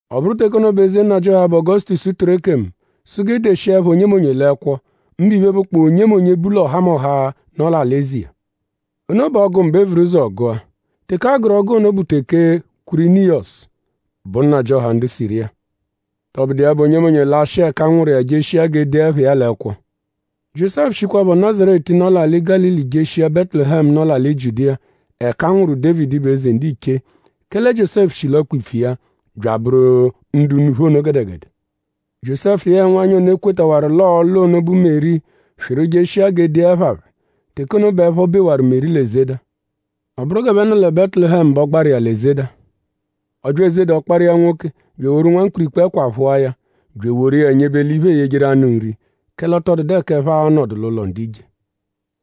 Ọ bụru teke ono bẹ eze nnajịoha, bụ Ọgosutosu tụru ekemu; sụ g'e deshia ẹpha onyemonye l'ẹkwo; mbụ iphe, bụkpoo onyemonye, bu l'ọhamoha, nọ l'alị-eze iya. Ono bụ ọ́gú mbụ, e vuru ụzo gụa. Teke a gụru ọ́gú ono bụ teke Kwịriniyosu bụ nnajịoha ndu Siriya. Tọbudu iya bụ; onyemonye lashịa ẹka a nwụru iya; jeshia g'e dee ẹpha iya l'ẹkwo. Jiósẹfu shikwaphọ lẹ Nazaretu, nọ l'alị Gálili jeshia Bẹtulehemu, nọ l'alị Jiudiya; ẹka a nwụru Dévidi, bụ eze ndiche; kẹle Jiósẹfu shi l'ọkpa-ipfu iya; bya abụru ndu unuphu ono gẹdegede. Jiósẹfu yẹe nwanyị ono, e kwetawaru l'ọo-lụ ono, bụ Meri swịru jeshia g'e dee ẹpha phẹ. Teke ono bẹ ẹpho bewaru Meri l'ezeda. Ọ bụru g'ẹphe nọ lẹ Bẹtulehemu bẹ ọ gbaru iya l'ezeda. Ọ bya ezeda ọkpara iya nwoke; bya eworu nwamkpirikpu ẹkwa phụa ya; bya eworu iya nyebe l'iphe, eeyejeru anụ nri; kẹle ọ tọ dụdu ẹka ẹphe a-nọdu l'ụlo ndu ije.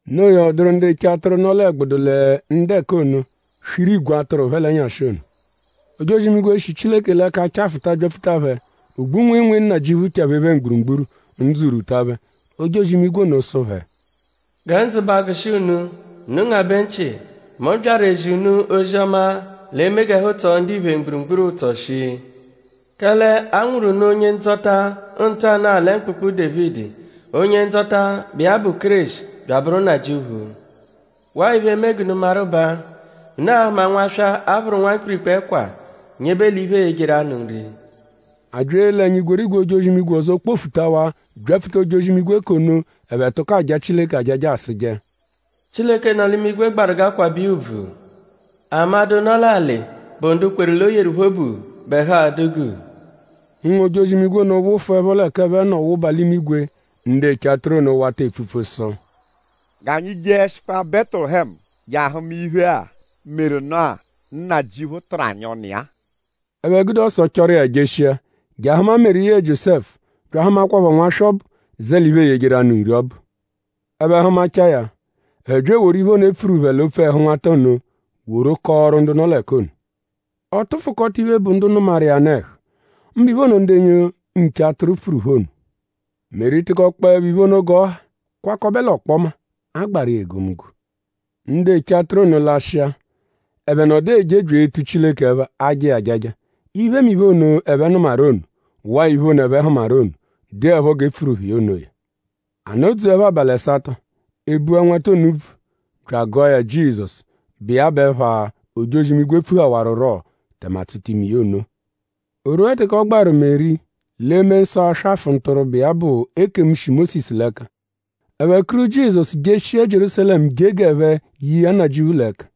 Noo ya; ọ dụru ndu eche atụru, nọ l'ẹgbudu lẹ ndu ẹka ono; swiru igwe atụru phẹ l'ẹnyashi ono. Ojozi-imigwe, shi Chileke l'ẹka chafụta byapfuta phẹ; ogbu-nwịinwii Nnajịuphu chaphee phẹ mgburugburu. Ndzụ rwuta phẹ. Ojozi-imigwe ono sụ phẹ: “Gẹ ndzụ ba agụshi unu; unu ngabẹ nchị. Mu byaru ezi unu ozi-ọma, l'e-me g'ẹhu tsọo ndiphe mgburugburu ụtso shii. Kẹle a nwụru unu Onye-Ndzọta ntanụ-a lẹ mkpụkpu Dévidi; Onye-Ndzọta, bụ iya bụ Kéreshi; bya abụru Nnajịuphu. Waa iphe, e-me g'unu maru baa: unu a-hụma nwaswa, a phụru nwamkpirikpu ẹkwa; nyebe l'iphe, eeyejeru anụ nri.” A bya ele ẹnya; igwerigwe ojozi-imigwe ọzo kpofutawaa byapfuta ojozi-imigwe k'ono ẹphe tụko aja Chileke ajaja asụje: “Chileke, nọ l'imigwe gbaru g'aakwabẹ iya ùbvù. Amadụ, nọ l'alị, bụ ndu kweru l'o yeru phẹ obu bẹ ẹhu a-dụ guu.” Ụnwu-ojozi-imigwe ono wụfuepho l'ẹka ẹphe nọ wụba l'imigwe; ndu eche atụru ono wata epfupfu sụ: “G'anyi jeẹshikwa Bẹtulehemu je ahụma iphe-a, meru nụ-a, Nnajịuphu tụru anyi ọnu iya-a.” Ẹphe gude ọso chọru iya jeshia; je ahụma Meri yẹe Jiósẹfu bya ahụmakwapho nwaswa ọbu, zẹ l'iphe, eeyejeru anụ nri ọbu. Ẹphe hụmachaa ya; ẹphe bya eworu iphe ono, e pfuru phẹ l'opfu ẹhu nwata ono woru kọoru ndu nọ l'ẹka ono. Ọ tụfukota iphe, bụ ndu nụmaru iya nụ ẹhu; mbụ iphe ono, ndu nche atụru pfuru phẹ ono. Meri tụkokpoepho iphe ono g'ọ ha kwakọbe l'ọkpoma; agbaru iya egomunggo. Ndu eche atụru ono lashịa. Ẹphe nọdu eje bya etu Chileke ẹpha; aja iya ajaja iphemiphe ono, ẹphe nụmaru ono waa iphe ono, ẹphe hụmaru ono, dụepho g'e pfuru phẹ iya onoya. A nọ-dzuẹpho abalị ẹsato; e bua nwata ono úbvù; bya agụa ya Jizọsu, bụ iya bụ ẹpha, ojozi-imigwe pfuhawarurọ; tẹme a tsụta ime iya ono. O rwua teke ọ gbaru Meri l'eme nsọ aswafụ ntụrwu, bụ iya bụ ekemu, shi Mósisu l'ẹka; ẹphe kuru Jizọsu jeshia Jierúsalẹmu je g'ẹphe ye iya Nnajịuphu l'ẹka,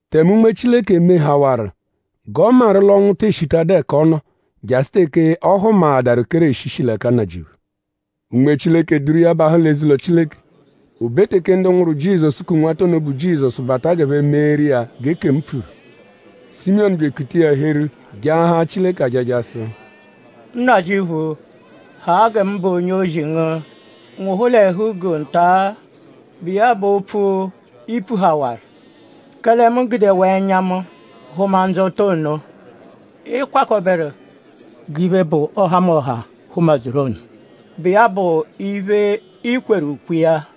tẹme Unme Chileke mehawaru g'ọ maru l'ọnwu tee shitadụ ẹka ọ nọ jasụ teke ọ hụmaadaru Kéreshi, shi l'ẹka Nnajịuphu. Unme Chileke duru iya bahụ l'eze-ụlo Chileke. O be teke ndu nwụru Jizọsu ku nwata ono, bụ Jizọsu bata g'ẹphe meeru iya g'ekemu pfuru; Simiyọnu bya ekuta iya heru jaahaa Chileke ajaja sụ: “Nnajịuphu; haa gẹ mụbe onye-ozi ngu nwụhu l'ẹhu-guu nta-a, bụ iya bụ opfu, i pfuhawaru; kẹle mu gudewaa ẹnya mu hụma Ndzọta ono, ị kwakọberu g'iphe, bụ ọhamoha hụma-dzuru ono, bụ iya bụ iphe, i kweru ukwe iya.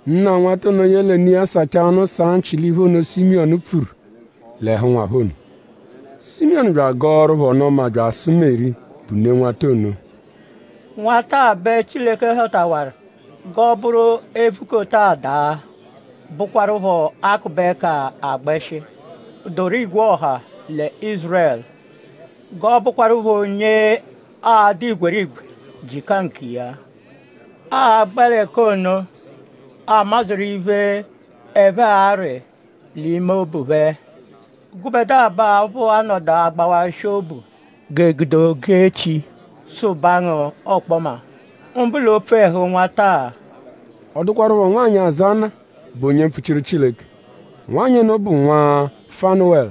Nna nwata ono yẹle ne iya sachaa ọnu saa nchị l'iphe ono, Simiyọnu pfuru l'ẹhu nwa phẹ ono. Simiyọnu bya agọoru phẹ ọnu-ọma bya asụ Meri, bụ ne nwata ono: “Nwata-a bẹ Chileke họtawaru g'ọ bụru e -vukota a daa; bụkwarupho a -kụbe ẹka a gbẹshi, dụru igwe ọha lẹ Ízurẹlu; g'ọ bụkwarupho onye aa-dụ igwerigwe jịka nkiya. Aagbẹ l'ẹka ono a madzuru iphe, ẹphe arị l'ime obu phẹ. Gụbedua bẹ aphụ a-nọdu agbawashị obu g'e gude ogu-echi sụbaa ngu ọkpoma; mbụ l'opfu ẹhu nwata-a.” Ọ dụkwarupho nwanyị, aza Ana, bụ onye mpfuchiru Chileke. Nwanyị ono bụ nwa Fanuwẹlu.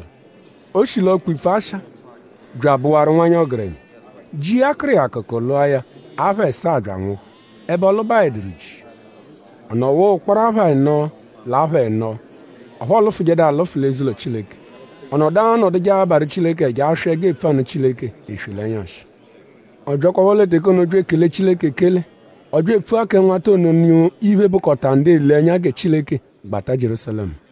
O shi l'ọkpa-ipfu Asha; bya abụwaru nwanyị ọgerenya. Ji iya kụru iya akụku; lụa ya apha ẹsaa bya anwụhu; ẹbe ọ lụbaeduru ji. Ọ nọwaa ụkporo apha ẹno l'apha ẹno. Ọphu ọo lụfujedu alụfu l'eze-ụlo Chileke. Ọ nọdu anọduje abarụ Chileke ẹja; aswị ẹgu epfu anụ Chileke eswe l'ẹnyashi. Ọ byakwaphọ lẹ teke ono bya ekele Chileke ekele. Ọ bya epfua kẹ nwata ono nụ iphe, bụkota ndu ele ẹnya gẹ Chileke gbata Jierúsalẹmu.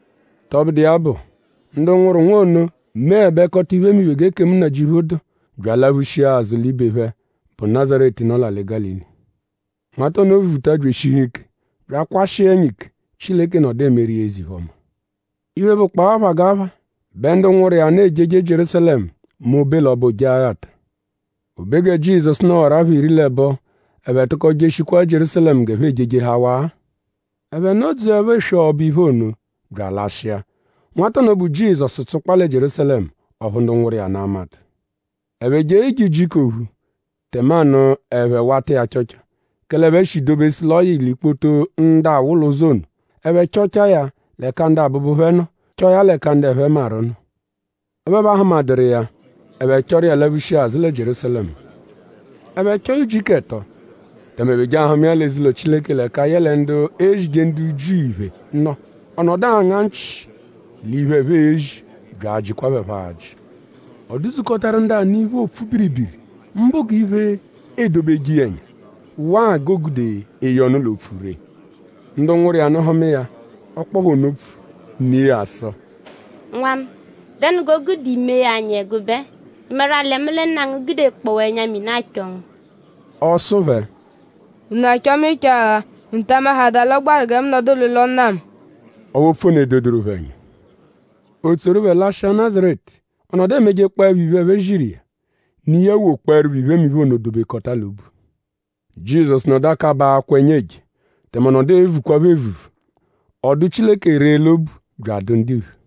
Tọbudu iya bụ; ndu nwụru nwa ono meẹbekota iphemiphe g'ekemu Nnajịuphu dụ; bya alaphushia azụ l'ibe phẹ, bụ Nazaretu, nọ l'alị Gálili. Nwata ono vuta bya eshihu ike; bya akwashịa ẹnya ike; Chileke nọdu emeru iya eze-iphe-ọma. Iphe, bụkpoo aphagapha bẹ ndu nwụru iya nụ ejeje Jierúsalẹmu mẹ o -be l'ọbo Ojeghata. O be gẹ Jizọsu nọwaru apha iri l'ẹbo; ẹphe tụko jeshikwaa Jierúsalẹmu g'ẹphe ejejehawaa. Ẹphe nọ-dzuẹpho eswe ọbo-iphe ono bya alashịa. Nwata ono, bụ Jizọsu tsụkpaa lẹ Jierúsalẹmu; ọphu ndu nwụru iya nụ amadụ. Ẹphe jee ije ujiku ophu; tẹmanu ẹphe wata iya achọcho; kẹle ẹphe shi dobesu l'ọ yị l'ikpoto ndu awụ l'ụzo ono. Ẹphe chọchaa ya l'ẹka abụbu phẹ nọ; chọo ya l'ẹka ndu ẹphe maru nọ; ọphu ẹphe ahụmaduru iya. Ẹphe chọru iya laphushia azụ lẹ Jierúsalẹmu. Ẹphe chọo ya ujiku ẹto; tẹme ẹphe je ahụma iya l'eze-ụlo Chileke l'ẹka yẹle ndu ezije ndu Jiu iphe nọ; ọ nọdu anga nchị l'iphe, ẹphe ezi bya ajịkwa phẹ phọ ajị. Ọ dụ-dzukọtaru ndu anụ iphe, oopfu biribiri; mbụ g'iphe edobeje iya ẹnya; waa g'o gude eye ọnu l'opfu ree. Ndu nwụru iya nụ hụma iya; ọ kpọo phẹ opfu. Ne iya sụ: “Nwa mu;?dẹnu g'o gude i mee ya anyi ẹgube-a??Ị maru-a lẹ mu lẹ nna ngu gudekpọwaa ẹnya-mini achọ ngu?” Ọ sụ phẹ: “?Unu achọ mu ịcho-agha??Unu ta amahaadaa l'ọ gbaru gẹ mu nọdu l'ụlo Nna mu?” Ọphu opfu ono edoduru phẹ ẹnya. O tsoru phẹ lashịa Nazaretu. Ọ nọdu emejekpọepho iphe, ẹphe ziru iya. Ne iya wokpọerupho iphemiphe ono dobekọta l'obu. Jizọsu nọdu akabaa akwa ẹnya eje; tẹme ọ nọdu evukwaphọ evuvu. Ọ dụ Chileke ree l'obu bya adụ ndiphe.